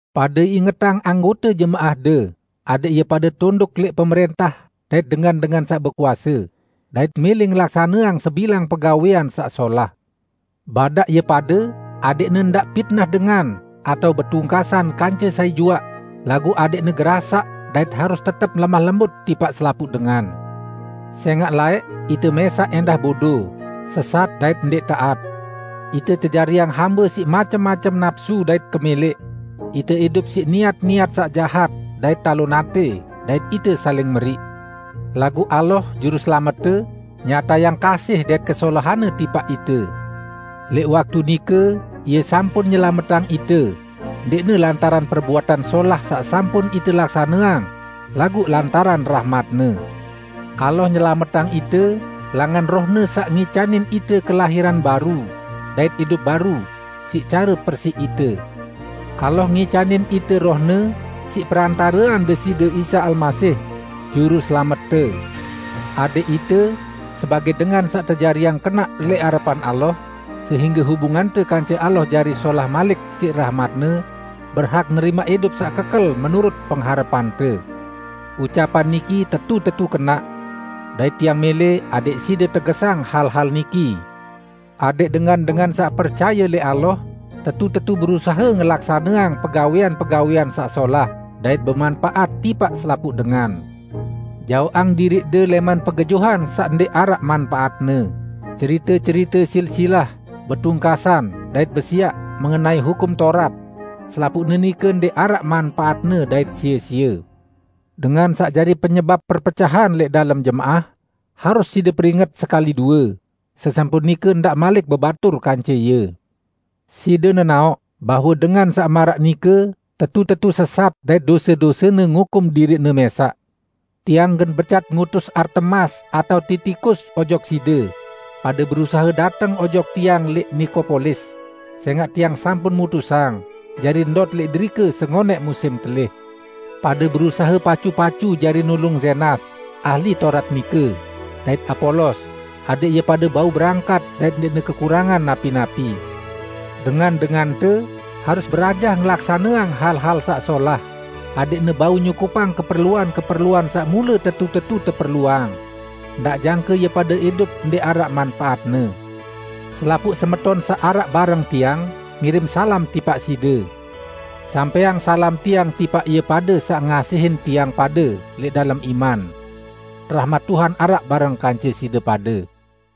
Pade ingetang anggote jemaahde adẽq ie pade tunduk lẽq pemrẽntah dait dengan-dengan saq bekuase, dait mẽlẽ ngelaksaneang sebilang pegawẽan saq solah. Badaq ie pade adẽqne ndaq pitnah dengan atao betungkasan kance sai juaq, laguq adẽqne gerasaq dait harus tetep lemah lembut tipaq selapuq dengan. Sẽngaq laẽq ite mẽsaq ẽndah bodo, sesat dait ndẽq taat. Ite tejariang hambe siq macem-macem napsu dait kemẽlẽq; ite idup siq niat-niat saq jahat dait talon atẽ, dait ite saling meriq. Laguq Allah, Juruselamette nyatayang kasih dait kesolahan-Ne tipaq ite. Lẽq waktu nike Ie sampun nyelametang ite, ndẽqne lantaran perbuatan solah saq sampun ite laksaneang, laguq lantaran rahmat-Ne. Allah nyelametang ite langan Roh-Ne saq ngicanin ite kelahiran baru dait idup baru, siq care persiq ite. Allah ngicanin ite Roh-Ne siq perantarean Deside Isa Almasih, Juruselamette, adẽq ite sebagẽ dengan saq tejariang kenaq lẽq arepan Allah sehingge hubungante kance Allah jari solah malik siq rahmat-Ne, berhak nerimaq idup saq kekel menurut pengharepante. Ucapan niki tetu-tetu kenaq. Dait tiang mẽlẽ adẽq side tegesang hal-hal niki, adẽq dengan-dengan saq percaye lẽq Allah tetu-tetu berusahe ngelaksaneang pegawẽan-pegawẽan saq solah dait bemanpaat tipaq selapuq dengan. Jaoqang diriqde lẽman pegejuhan saq ndẽq araq manpaatne, cerite-cerite silsilah, betungkasan dait besiaq mengenai Hukum Taurat. Selapuqne nike ndẽq araq manpaatne dait sie-sie. Dengan saq jari penyebap perpecahan lẽq dalem jemaah, harus side peringet sekali due; sesampun nike ndaq malik bebatur kance ie. Side nenaoq bahwe dengan saq maraq nike tetu-tetu sesat dait dose-dosene ngukum diriqne mẽsaq. Tiang gen becat ngutus Artemas atao Titikus ojok side, pade berusahe dateng ojok tiang lẽq Nikopolis, sẽngaq tiang sampun mutusang jari ndot lẽq derike sengonẽq musim telih. Pade berusahe pacu-pacu jari nulung Zenas, ahli Taurat nike, dait Apolos, adẽq ie pade bau berangkat dait ndẽqne kekurangan napi-napi. Dengan-dengante harus berajah ngelaksaneang hal-hal saq solah, adẽqne bau nyukupang keperluan-keperluan saq mule tetu-tetu teperluang; ndaq jangke ie pade idup ndẽq araq manpaatne. Selapuq semeton saq araq bareng tiang, ngirim salam tipaq side. Sampẽang salam tiang tipaq ie pade saq ngasihin tiang pade lẽq dalem iman. Rahmat Tuhan araq bareng kance side pade.